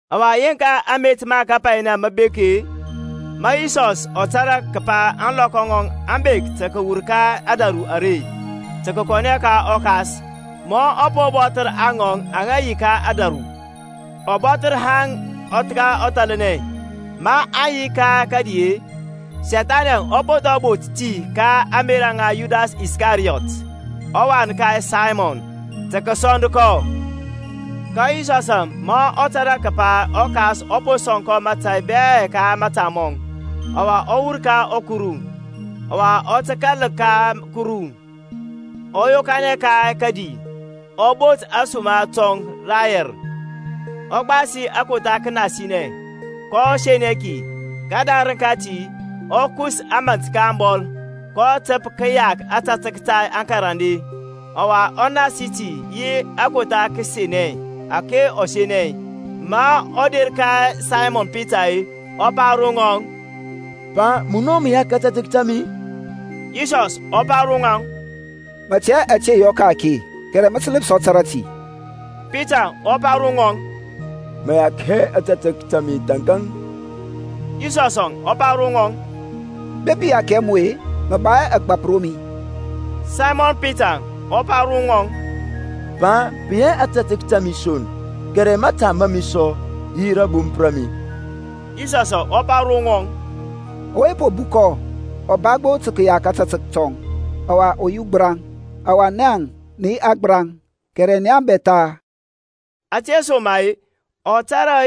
Ɔwa yeŋka amet ma kapainɛ mə bek-e, ma Yisɔs ɔ tȧrȧ kəpa ȧŋlɔkɔ ŋɔŋ aŋ bek tə kəwur ka ȧdȧru are tə kəkɔnɛ ka ɔKas, ma ɔ po bɔthər aŋɔŋ aŋa yi ka ȧdȧru, ɔ bɔthər ŋa haŋ ka ɔthalnɛ. Maŋ yi ka kədi, Sethanɛŋ ɔ po thɔ bot ti ka ȧŋmerȧ ŋa Yudas Iskariyɔt, ɔwan ka Saymɔn, tə kəsɔnd kɔ. Ka Yisɔsȧŋ ma ɔ tȧrȧ kəpa ɔKas ɔ po sɔŋ mȧtȧy bɛ ka mȧta mɔŋ, ɔwa ɔ wur ka Kuru, ɔwa ɔ tə kȧl ka Kuru; ɔ yokanɛ ka kədi, ɔ bot ȧsuma tɔŋ rayɛr; ɔ gbasi kotha kənasianɛ, kɔ senɛ ki. Kədarəŋ kati ɔ kus mȧnt ka abɔl, kɔ təp kəyak ȧtȧtək ta aŋkarande, ɔwa ɔ nasi ti yi akotha kənasianɛ ȧke ɔ senɛ. Ma ɔ der ka Saymɔn Pitar-e ɔ pa ro ŋɔŋ, Pa, munɔ mə yak ȧtȧtək ta mi-i? Yisɔs ɔ pa ro ŋɔŋ, Mə tɛ hɛ ȧte i yɔ ka-ake; kɛrɛ mə tə ləpsɔ tȧrȧ ti. Pitaŋ ɔ pa ro ŋɔŋ, Mə yak hɛ ȧtȧtək ta mi thȧnkȧŋ. Yisɔsȧŋ ɔ pa ro ŋɔŋ, Bepi i yak hɛ mu-e, mə ba hɛ ȧgbȧp ro mi. Saymɔn Pitaŋ ɔ pa ro ŋɔŋ, Pa, pə yi hɛ ȧtȧtək ta mi son, kɛrɛ mȧta ma mi sɔ, yi rȧbomp ra mi. Yisɔsȧŋ ɔ pa ro ŋɔŋ, Ɔwe po bukɔ ɔ ba gbo tə kəyak ȧtȧtək tɔŋ, ɔwa ɔ yi ugbəraŋ: ɔwa naŋ nə yi agbəraŋ, kɛrɛ nia bɛ tha. Ȧtesoma-e, ɔ tȧrȧ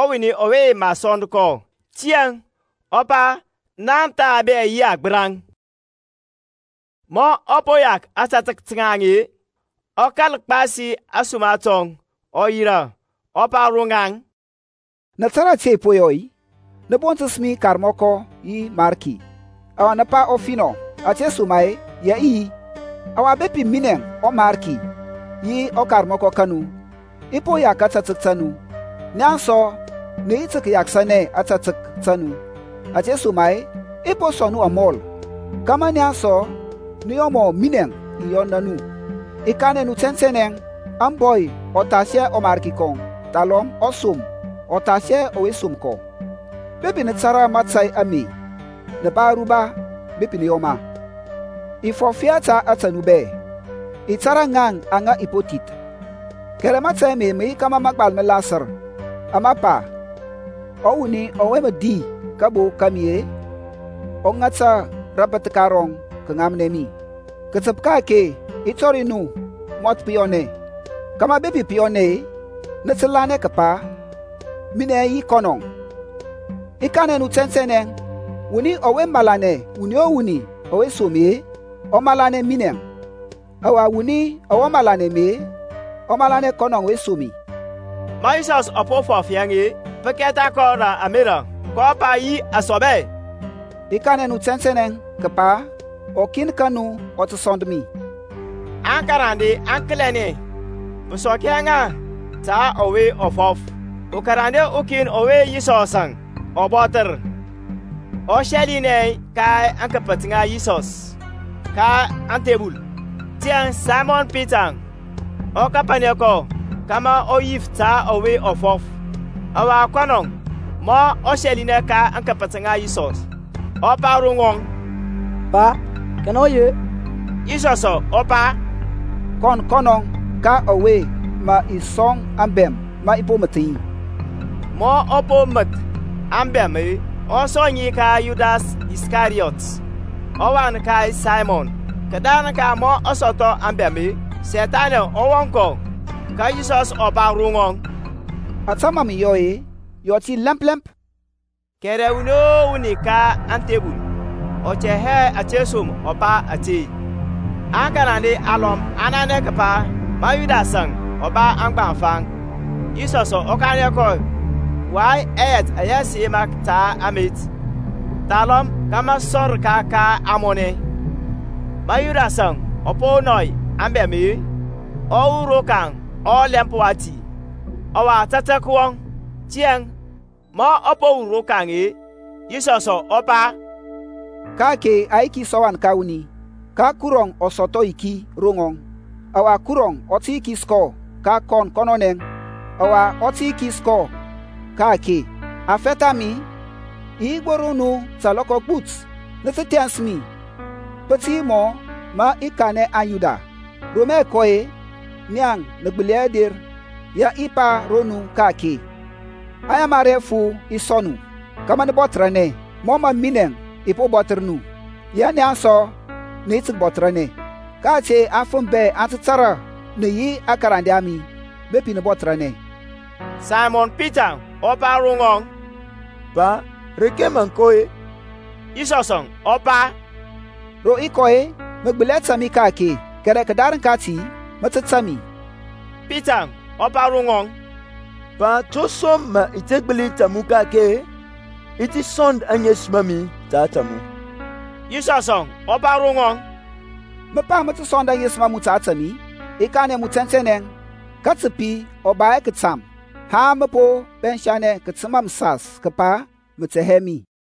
ɔwuni ɔwe mə sɔnd kɔ; tiyȧŋ ɔ pa, Nia bɛ tha yi agbəraŋ. Ma ɔ po yak ȧtȧtək ta ŋaŋ-e, ɔ kȧl gbasi ȧsuma tɔŋ, ɔ yirȧ, ɔ pa ro ŋaŋ, Nə tȧrȧ ȧte i po yɔ nu-i? Nə bontəs mi Karmɔkɔ yi Mariki; ɔwa nə pa ɔfinɔ: ȧtesoma-e ya i yi. Ɔwa bepi minɛŋ, ɔMarki yi ɔKarmɔkɔ ka nu, i po yak ȧtȧtək ta nu, nia sɔ nə yi tə kəyakəsanɛ ȧtȧtək ta nu. Ȧtesoma-e i po sɔŋ nu amɔl, kȧmȧ nia sɔ nə yɔ mɔ minɛŋ i yɔna nu. I kanɛ nu tɛntɛnɛ, Ȧŋbɔy ɔ thas hɛ ɔmarki kɔŋ; thalɔm ɔsom ɔ thas hɛ ɔwe som kɔ. Bepi nə tȧrȧ mȧtȧy ame, nə ba aruba bepi nə yɔ ma. I fɔf hɛ ta ȧtȧ nu bɛ; i tȧrȧ ŋaŋ aŋa i po thith: kɛrɛ mȧtȧy ame mə yi kȧmȧ mȧgbal mə lasər, ama pa, Ɔwuni ɔwe mə di kabo ka mi-e ɔ ŋata rabəthka rɔŋ kəŋamnɛ mi. Kətəp ka-ake i tɔri nu mɔth pə yɔnɛ, kȧmȧ bepi pə yɔnɛ-e, nə tə lanɛ kəpa minɛ yi kɔnɔŋ. I kanɛ nu tɛntɛnɛ, Ɔwuni ɔwe malanɛ wuni o wuni ɔwe i som-e, ɔ malanɛ minɛŋ; ɔwa ɔwuni ɔwe malanɛ mi-e, ɔ malanɛ kɔnɔŋ ɔwe som mi. Ma Yisɔsȧŋ ɔ po fɔf yaŋ-e, pə kɛtha kɔ rə ȧmerȧ, kɔ pa yi asɔbɛ, I kanɛ nu tɛntɛnɛ kəpa ukin ka nu ɔ tə sɔnd mi. Aŋkarande aŋ kəlianɛ, pə sɔk hɛ ŋa ta ɔwe ɔ fɔf. Ukarande ukin ɔwe Yisɔsȧŋ ɔ bɔthər, ɔ sɛlinɛ ka aŋkəpət ŋa Yisɔs, ka ȧŋthebul. Tiyȧŋ Saymɔn Pitaŋ ɔ kapanɛ kɔ, kȧmȧ ɔ yif ta ɔwe ɔ fɔf. Ɔwa kɔnɔ ma ɔ sɛlinɛ ka aŋkəpət ŋa Yisɔs, ɔ pa ro ŋɔŋ, Pa, kanɛ ɔ yi-e? Yisɔsȧŋ ɔ pa, Kɔn kɔnɔŋ, ka ɔwe mə i sɔŋ abɛm ma i po məth ŋi. Ma ɔ po məth ȧŋbɛm-e ɔ sɔŋ ŋi ka Yudas Iskariyɔt, ɔwan ka Saymɔn. Kədarəŋ ka ma ɔ sɔthɔ ȧŋbɛm-e, Sethani ɔ wɔŋ kɔ, ka Yisɔsȧŋ ɔ pa ro ŋɔŋ, Ȧtȧ mȧ mə yɔ-e, yɔ ti lɛmp lɛmp. Kɛrɛ wuni o wuni ka ȧŋthebul ɔ tɛ hɛ atəsom ɔ pa ȧte. Aŋkarande alɔm aŋ nanɛ kəpa ma Yudasȧŋ ɔ ba aŋgbaŋfa, Yisɔsȧŋ ɔ kanɛ kɔ, Way ɛyɛt ɛyɛ sə yema ta amet; thalɔm kȧmȧ ɔ sɔŋ rəka ka ȧŋmɔnɛ. Ma Yudasȧŋ ɔ po nɔy ȧŋbɛm-e ɔ wur rokaŋ ɔlɛmp wati; ɔwa tȧtȧk wɔŋ. Tiyȧŋ ma ɔ po wur rokaŋ-e, Yisɔsȧŋ ɔ pa, Ka-ake a yikis ɔWan ka wuni, ka Kurɔŋ ɔ sɔthɔ ayiki ro ŋɔŋ; ɔwa Kurɔŋ ɔ tə yikis kɔ ka kɔn kɔnɔnɛ, ɔwa ɔ tə yikis kɔ ka ka-ake. Aŋfɛth a mi, i yi gbo ro nu ta alɔkɔ agbut. Nə tə thɛns mi; pə tə yi mɔ mə i kanɛ aŋYuda, Ro mə i kɔ-e nia nə gbəli hɛ der, ya i pa ro nu ka-ake. Ayamari afu i sɔŋ nu, kȧmȧ nə bɔthərȧnɛ; mɔ mə minɛŋ i po bɔthər nu, ya nia sɔ nə yi tə kəbɔthəranɛ. Ka ȧte afəm bɛ aŋ tə tȧrȧ nə yi aŋkarande a mi, bepi nə bɔthərȧnɛ. Saymɔn Pitaŋ ɔ pa ro ŋɔŋ, Pa, reke mȧŋ kɔ-e? Yisɔsȧŋ ɔ pa, Ro i kɔ-e, mə gbəli hɛ tȧŋ mi ka-ake: kɛrɛ kədarəŋ kati mə tə tȧŋ mi. Pitaŋ ɔ pa ro ŋɔŋ, Pa, to som mə i te gbəli tȧŋ mu ka-ake-e? I ti sɔnd aŋesəm a mi ta ȧte mu. Yisɔsȧŋ ɔ pa ro ŋɔŋ, Mə pa mə tə sɔnd aŋesəm a mu ta ȧtȧ mi-i? I kanɛ mu tɛntɛnɛ, katəpi ɔ ba hɛ kətam, haŋ mə po pɛnsa katəma məsas kəpa mə tɛ hɛ mi.